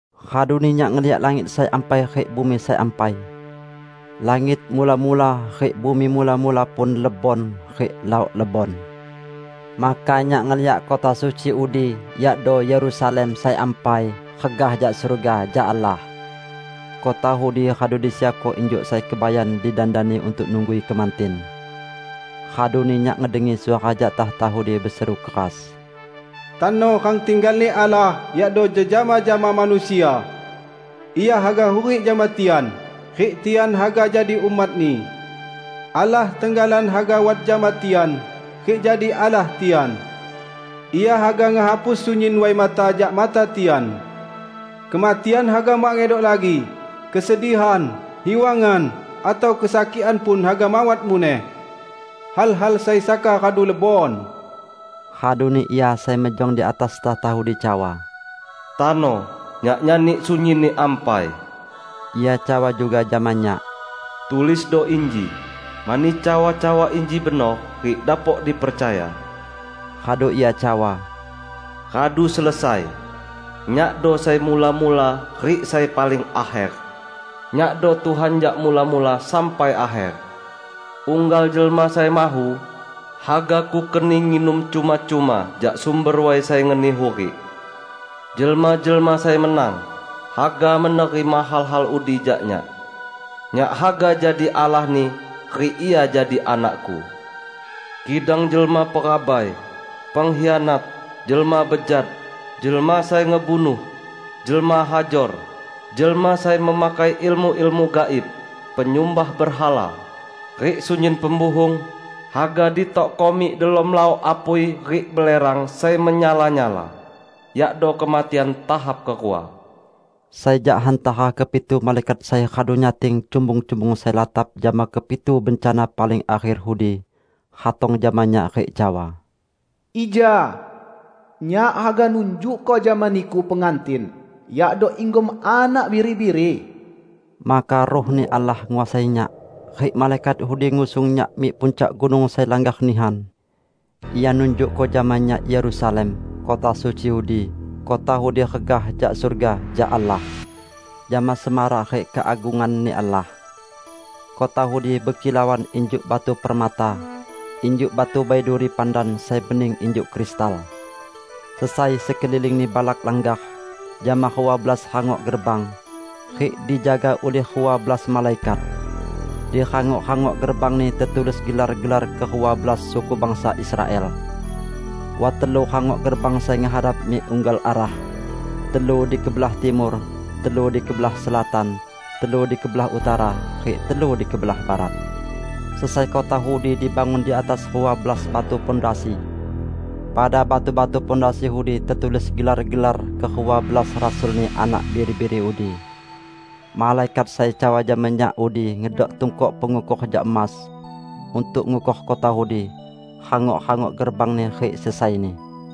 Raduni nyak ngeliak langit sai ampai rik bumi sai ampai. Langit mula-mula rik bumi mula-mula pun lebon, rik laok lebon. Maka nyak ngeliak kota suci udi, yakdo Yerusalem sai ampai, regah jak surga jak Allah. Kota udi radu disiapko injuk sai kebayan didandani untuk nunggui kemantin. Raduni nyak ngedengi suara jak takhta udi beseru keras, "Tano rang tinggal-Ni Allah yakdo jejama jama manusia! Ia haga hurik jama tian, rik tian haga jadi umat-Ni. Allah tenggalan haga wat jama tian rik jadi Allah tian. Ia haga ngehapus sunyin way mata jak mata tian. Kematian haga mak ngedok lagi; kesedihan, hiwangan, atau kesakikan pun haga mawat muneh. Hal-hal sai saka radu lebon." Raduni Ia sai mejong di atas takhta udi cawa, "Tano Nyak nyani sunyinni ampai!" Ia cawa juga jama nyak, "Tulisdo inji, mani cawa-cawa inji benor rik dapok dipercaya." Radu Ia cawa, "Radu selesai! Nyakdo sai mula-mula rik sai paling akher; Nyakdo Tuhan jak Mula-mula sampai Akher. Unggal jelma sai mahu, haga Kukeni nginum cuma-cuma jak sumber way sai ngeni hurik. Jelma-jelma sai menang haga menerima hal-hal udi jak Nyak. Nyak haga jadi Allahni, rik ia jadi anak-Ku. Kidang jelma perabai, pengkhianat, jelma bejat, jelma sai ngebunuh, jelma hajor, jelma sai memakai ilmu-ilmu gaib, penyumbah berhala, rik sunyin pembuhung, haga ditokko mik delom laok apui rik belerang sai menyala-nyala, yakdo kematian tahap kerua." Sai jak hantara kepitu malaikat sai radu nyating cumbung-cumbung sai latap jama kepitu bencana paling akher udi ratong jama nyak rik cawa, "Ija! Nyak haga nunjukko jama niku Pengantin, yakdo inggom Anak Biri-biri." Maka Ruh-Ni Allah nguasai nyak, rik malaikat udi ngusung nyak mik puncak gunung sai langgar nihan. Ia nunjukko jama nyak Yerusalem, kota suci udi, kota udi regah jak surga, jak Allah; jama semarak rik keagungan-Ni Allah. Kota udi bekilauan injuk batu permata, injuk batu baiduri pandan sai bening injuk kristal. Sesai sekelilingni balak langgar, jama rua belas rangok gerbang, rik dijaga ulih rua belas malaikat. Di rangok-rangok gerbangni tetulis gelar-gelar kerua belas suku bangsa Israel. Wat telu rangok gerbang sai ngehadap mik unggal arah: telu di kebelah timur, telu di kebelah selatan, telu di kebelah utara, rik telu di kebelah barat. Sesai kota udi dibangun di atas rua belas batu pondasi. Pada batu-batu pondasi udi tetulis gelar-gelar kerua belas rasul-Ni Anak Biri-biri udi. Malaikat sai cawa jama nyak udi ngedok tungkok pengukor jak emas, untuk ngukor kota udi, rangok-rangok gerbangni rik sesaini.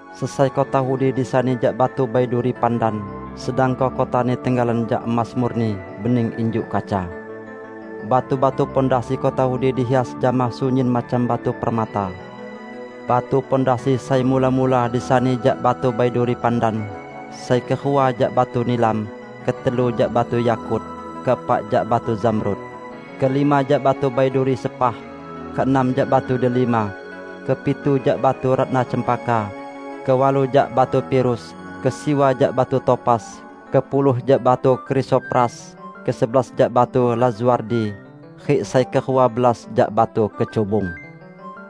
Sesai kota udi disani jak batu baiduri pandan, sedangko kotani tenggalan jak emas murni, bening injuk kaca. Batu-batu pondasi kota udi dihias jama sunyin macam batu permata. Batu pondasi sai mula-mula disani jak batu baiduri pandan, sai kerua jak batu nilam, ketelu jak batu yakut, keepak jak batu zamrud, kelima jak batu baiduri sepah, keenam jak batu delima, kepitu jak batu ratna cempaka, kewalu jak batu pirus, kesiwa jak batu topas, kepuluh jak batu krisopras, kesebelas jak batu lazuardi, rik sai kerua belas jak batu kecubung.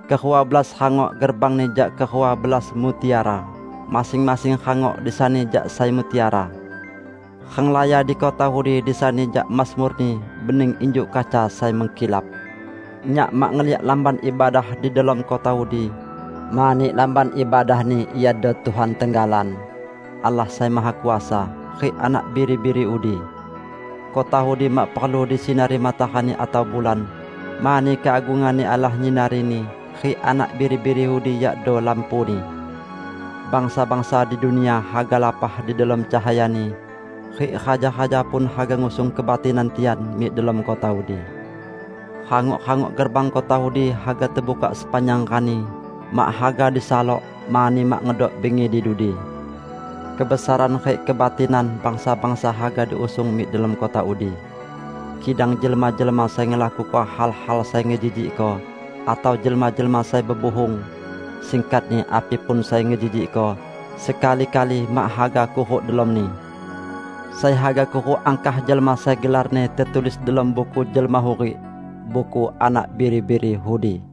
Kerua belas rangok gerbangni jak kerua belas mutiara, masing-masing rangok disani jak sai mutiara. Renglaya di kota udi disani jak emas murni, bening injuk kaca sai mengkilap. Nyak mak ngeliak Lamban Ibadah di delom kota udi, mani Lamban Ibadahni iado Tuhan tenggalan, Allah Sai Mahakuasa, rik Anak Biri-biri udi. Kota udi mak perlu disinari matarani atau bulan, mani keagungan-Ni Allah nyinarini, rik Anak Biri-biri udi yakdo lampuni. Bangsa-bangsa di dunia haga lapah di delom cahayani, rik raja-raja pun haga ngusung kebatinan tian mik delom kota udi. Rangok-rangok gerbang kota udi haga tebukak sepanjang rani; mak haga disalok, mani mak ngedok bingi di dudi. Kebesaran rik kebatinan bangsa-bangsa haga diusung mik delom kota udi. Kidang jelma-jelma sai ngelakuko hal-hal sai ngejijikko, atau jelma-jelma sai bebuhung -- singkatni api pun sai ngejijikko, sekali-kali mak haga kuruk delomni. Sai haga kuruk angkah jelma sai gelarni tetulis delom Buku Jelma Hurik, buku Anak Biri-biri udi.